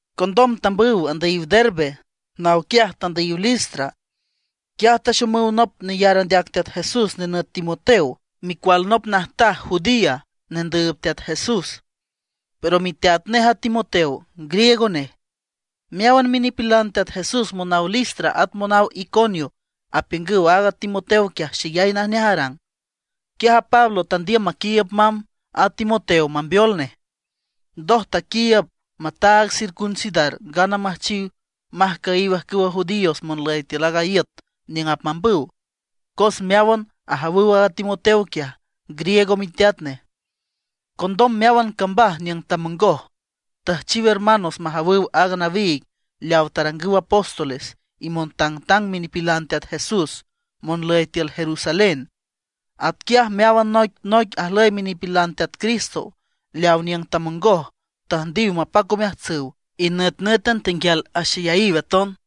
Condom tambüw tandüyiw Derbe, naw quiaj tandüyiw Listra. Quiaj taxomüw nop neyar andeac Teat Jesús nenüt Timoteo, micual nop najtaj judía nendüüb Teat Jesús, pero miteat nej a Timoteo griego nej. Meáwan minipilan Teat Jesús monaw Listra at monaw Iconio apiüngüw aaga Timoteo quiaj xeyay najneaj arang. Quiaj a Pablo tandiüm maquiiüb mamb a Timoteo mambeol nej. Ndoj taquiiüb mataag circuncidar ngana müjchiw majcüyiw ajcüwa judíos monlüy tiül aaga iüt niüng apmambüw, cos meáwan ajawüw aaga Timoteo quiaj, griego miteat nej. Condom meáwan cambaj niüng tamongoj, tüjchiw hermanos majawüw aaga nawiig leaw tarangüw apóstoles y montangtang minipilan Teat Jesús monlüy tiül Jerusalén. Atquiaj meáwan noic noic ajlüy minipilan Teat Cristo leaw niüng tamongoj tüjndiw mapac omeajtsüw, y nütnǘtan tenguial axeyayiw aton.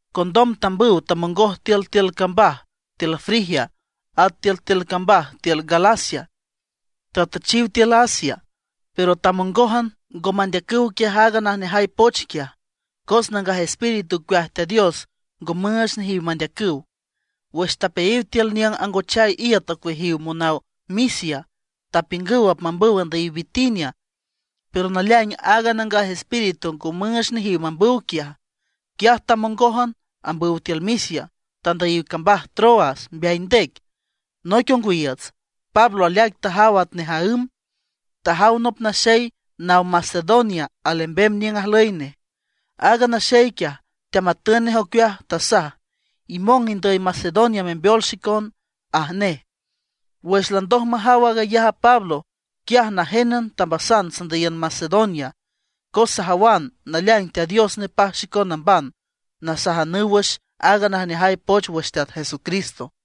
Condom tambüw tamongoj tiültiül cambaj tiül Frigia at tiültiül cambaj tiül Galacia. Tatüchiw tiül Asia, pero tamongójan, ngo mandeacüw quiaj aaga najneajay poch quiaj; cos Nangaj Espíritu ocueaj Teat Dios ngo müüch nejiw mandeacüw. Wüx tapeayiw tiül niüng angochay iüt ocueajiw monaw Misia, tapiüngüw apmambüw andüyiw Bitinia, pero naleaing aaga Nangaj Espíritu ngo müüch nejiw mambüw quiaj. Quiaj tamongójan ambüw tiül Misia, tandüyiw cambaj Troas mbeay ndec. Noic ongwiiüts, Pablo aleaic tajaw atnej aǘm, tajaw nop naxey naw Macedonia alembem niüng ajlüy nej. Aaga naxey quiaj, teamatün nej ocueaj, tasaj: “Imong indüy Macedonia membeol xicon”, aj nej. Wüx landoj majaw aag ayaj a Pablo, quiaj najénan tambasan sandüyiün Macedonia, cos sajawan naleaing Teat Dios nepaj xicon namban nasajanüw wüx aaga najneajay poch wüx Teat Jesucristo.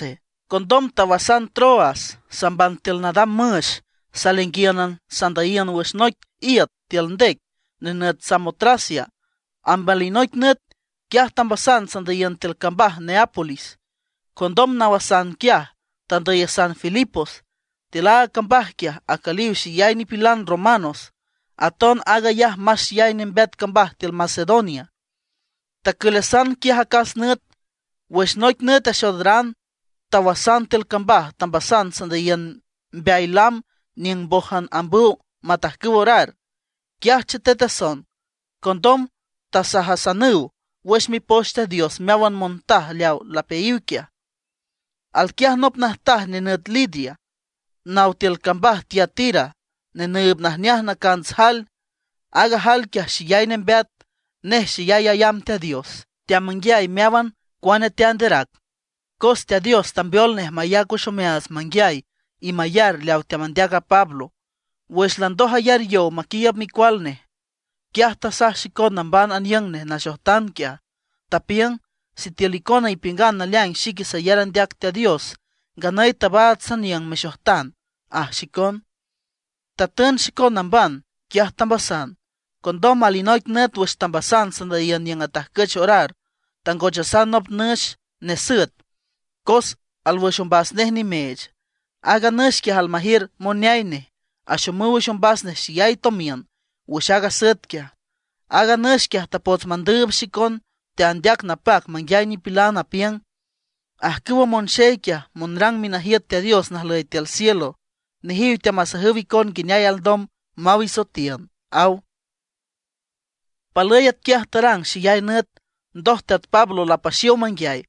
Condom tawasan Troas samban tiül nadam müx, saleainguíünan sandüyiün wüx noic iüt tiül ndec nenüt Samotracia. Amb alinoic nüt, quiaj tambasan sandüyiün tiül cambaj Neápolis. Condom nawasan quiaj, tandüyasan Filipos. Tiül aaga cambaj quiaj acüliw xeyay nipilan Romanos; aton aag ayaj más xeyay nembeat cambaj tiül Macedonia. Tacülasan quiaj acas nüt. Wüx noic nüt axoodaran tawasan tiül cambaj, tambasan sandüyiün mbeay lam niüng mbójan ambüw matajcüw orar. Quiaj chetetason. Condom tasajasanüw wüx Mipoch Teat Dios meáwan montaj leaw lapeayiw quiaj. Alquiaj nop najtaj nenüt Lidia, naw tiül cambaj Tiatira, nenüüb najneaj nacants jael. Aaga jael quiaj xeyay nembeat. Nej xeyay ayamb Teat Dios, teamanguiay meáwan cuane teanderac. Cos Teat Dios tambeol nej mayac wüx omeaats manguiay y mayar leaw teamandeac a Pablo. Wüx landoj ayar yow maquiiüb micual nej, quiaj tasaj xicon namban aniüng nej naxojtan quiaj, tapiüng: ―Sitiül icona ipiüngan naleaing xique sayar andeac Teat Dios, nganüy tabaats saniüng mexojtan ―aj xicon. Tatün xicon namban, quiaj tambasan. Condom alinoic nüt wüx tambasan sandüyiün niüng atajcüch orar, tangochasan nop nüx nesüet, cos alwüx ombas nej nimeech. Aaga nüx quiaj almajiür moneay nej, axomüw wüx ombas nej xeyay tomiün wüx aaga asüet quiaj. Aaga nüx quiaj tapots mandüüb xicon, teandeac napac manguiay nipilan, apiüng: ―Ajcüwa monxey quiaj, monrang minajiüt Teat Dios najlüy tiül cielo. Nejiw teamasajüw icon nguineay alndom maw isoetiün ―aw. Palüy atquiaj tarang xeyay nüt. Ndoj Teat Pablo lapaxiow manguiay,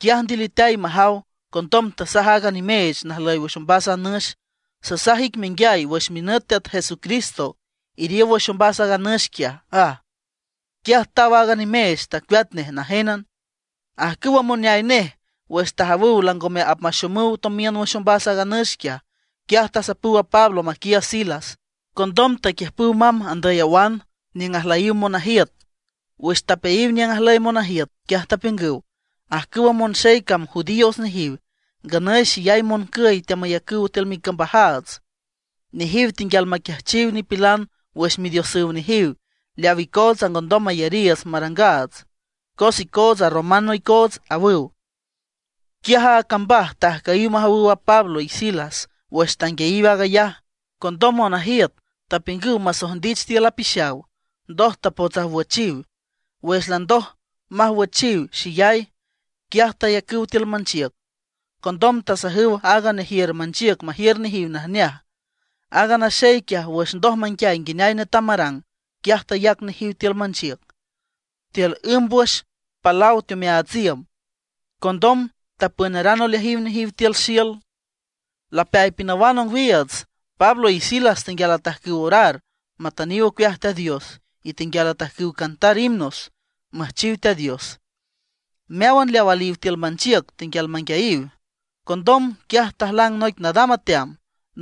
quiaj ndiliteay majaw. Condom tasaj aaga nimeech najlüy wüx ombas a nüx: ―Sasaj ic menguiay wüx minüt Teat Jesucristo, iriow wüx ombas aaga nüx quiaj ―aj. Quiaj taw aaga nimeech, tacueat nej najénan. Ajcüwa moneay nej, wüx tajawüw langome apmaxomüw tomiün wüx ombas aaga nüx quiaj, quiaj tasapüw a Pablo maquiiüb a Silas. Condom taquiüjpüw mamb andüy awan niüng ajlüyiw monajiüt. Wüx tapeayiw niüng ajlüy monajiüt, quiaj tapiüngüw: ―Ajcüwa monxey cam judíos nejiw, nganüy xeyay moncüy teamayacüw tiül micambajaats. Nejiw tenguial maquiajchiw nipilan wüx midiosüw nejiw leaw icootsa ngondom mayariiüts marangaats, cos icootsa romanos icoots ―awüw. Quiaj a cambaj tajcüyiw majawüw a Pablo y Silas wüx tanguiayiw aag ayaj. Condom monajiüt tapiüngüw masojndich tiül apixaw; ndoj tapots awüjchiw. Wüx landoj mawüjchiw xeyay, quiaj tayacüw tiül manchiüc. Condom tasajüw aaga nejiür manchiüc majiür nejiw majneaj. Aaga naxey quiaj, wüx ndoj manguiay nguineay netam marang, quiaj tayac nejiw tiül manchiüc, tiül ümb wüx palaw teomeaats iüm. Condom tapünaran oleajiw nejiw tiül xiül. Lapeay pinawan ongwiiüts, Pablo y Silas tenguial atajcüw orar matüniw ocueaj Teat Dios, y tenguial atajcüw cantar himnos müjchiw Teat Dios. Meáwan leaw aliw tiül manchiüc tenguial manguiayiw. Condom, quiaj tajlang noic nadam ateam,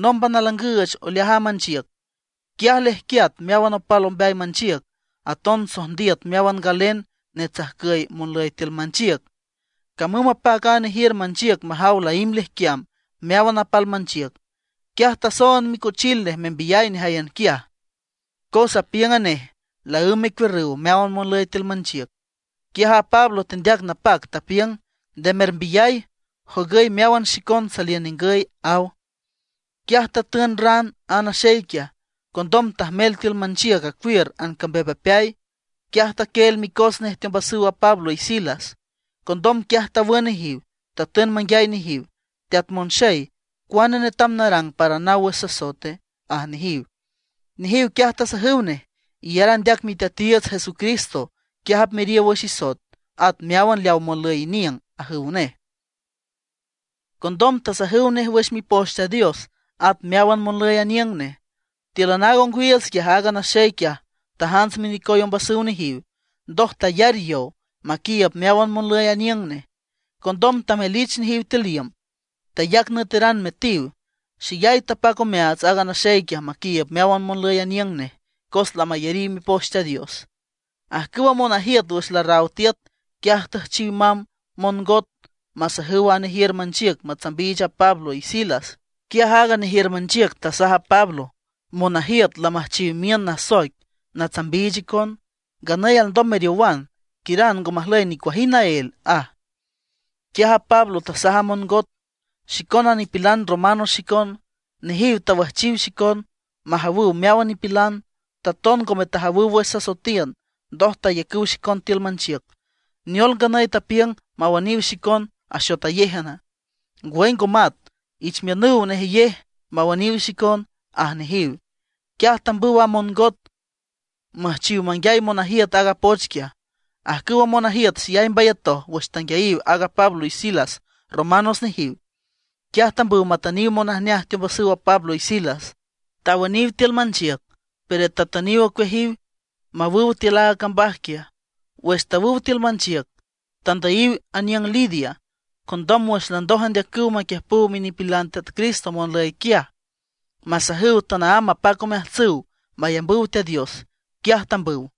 nómban alangüüch oleaj a manchiüc. Quiaj lejquiat meáwan apal ombeay manchiüc. Aton sojndiüt meáwan galen netsajcüy monlüy tiül manchiüc. Camüm mapac a nejiür manchiüc majaw laímb lejquiam meáwan apal manchiüc, quiaj tasoond micochil nej membiyay nejáyan quiaj. Cos apiüng a nej laǘmb mecuiürrüw meáwan monlüy tiül manchiüc. Quiaj a Pablo tendeac napac, tapiüng: ―Nde mermbiyay, jogüy meáwan xicon saliün ningüy ―aw. Quiaj tatün ran aaga naxey quiaj. Condom tajmel tiül manchiüc acuiür ancambeapmbeapeay. Quiaj taquieel micos nej teombasüw a Pablo y Silas. Condom quiaj tawün nejiw, tatün manguiay nejiw: ―Teat monxey ¿cuane netam narang para naw wüx sasoete? ―aj nejiw. Nejiw quiaj tasajüw nej: ―Iyar andeac Miteatiiüts Jesucristo, quiaj apmeriow wüx isoet, at meáwan leaw monlüy iniüng ―ajüw nej. Condom tasajüw nej wüx Mipoch Teat Dios, at meáwan monlüy aniüng nej. Tíülan aaga ongwiiüts quiaj, aaga naxey quiaj tajants minecoy ombasüw nejiw. Ndoj tayar yow maquiiüb meáwan monlüy aniüng nej. Condom tamelich nejiw tiül iüm, tayac nüeteran metiw. Xeyay tapac omeaats aaga naxey quiaj maquiiüb meáwan monlüy aniüng nej, cos lamayariw Mipoch Teat Dios. Ajcüwa monajiüt wüx larraw tiüt, quiaj tüjchiw mamb mongot masajüw a nejiür manchiüc matsambiich a Pablo y Silas. Quiaj aaga nejiür manchiüc tasaj a Pablo: ―Monajiüt lamüjchiw miün nasoic natsambiich icon. Nganüy alndom meriowan, quiüran ngo majlüy nicuajind naél ―aj. Quiaj a Pablo tasaj a mongot: ―Xicona nipilan romano xicon, nejiw tawüjchiw xicon majawüw meáwan nipilan. Taton ngome tajawüw wüx sasoetiün, ndoj tayacüw xicon tiül manchiüc. ¿Neol nganüy tapiüngüw mawüniw xicon axotayéjan? ¡Ngwüy ngo mat! Ich miünüw nejeyej mawüniw xicon ―aj nejiw. Quiaj tambüw a mongot müjchiw manguiay monajiüt aaga poch quiaj. Ajcüwa monajiüt xeyay mbayatoj wüx tanguiayiw aaga Pablo y Silas romanos nejiw. Quiaj tambüw matüniw monajneaj teombasüw a Pablo y Silas; tawüniw tiül manchiüc, pero tatüniw ocueajiw mawüw tiül aaga cambaj quiaj. Wüx tawüw tiül manchiüc, tandüyiw aniüng Lidia. Condom wüx landoj andeacüw maquiüjpüw minipilan Teat Cristo monlüy quiaj, masajüw tanaámb mapac omeajtsüw mayambüw Teat Dios, quiaj tambüw.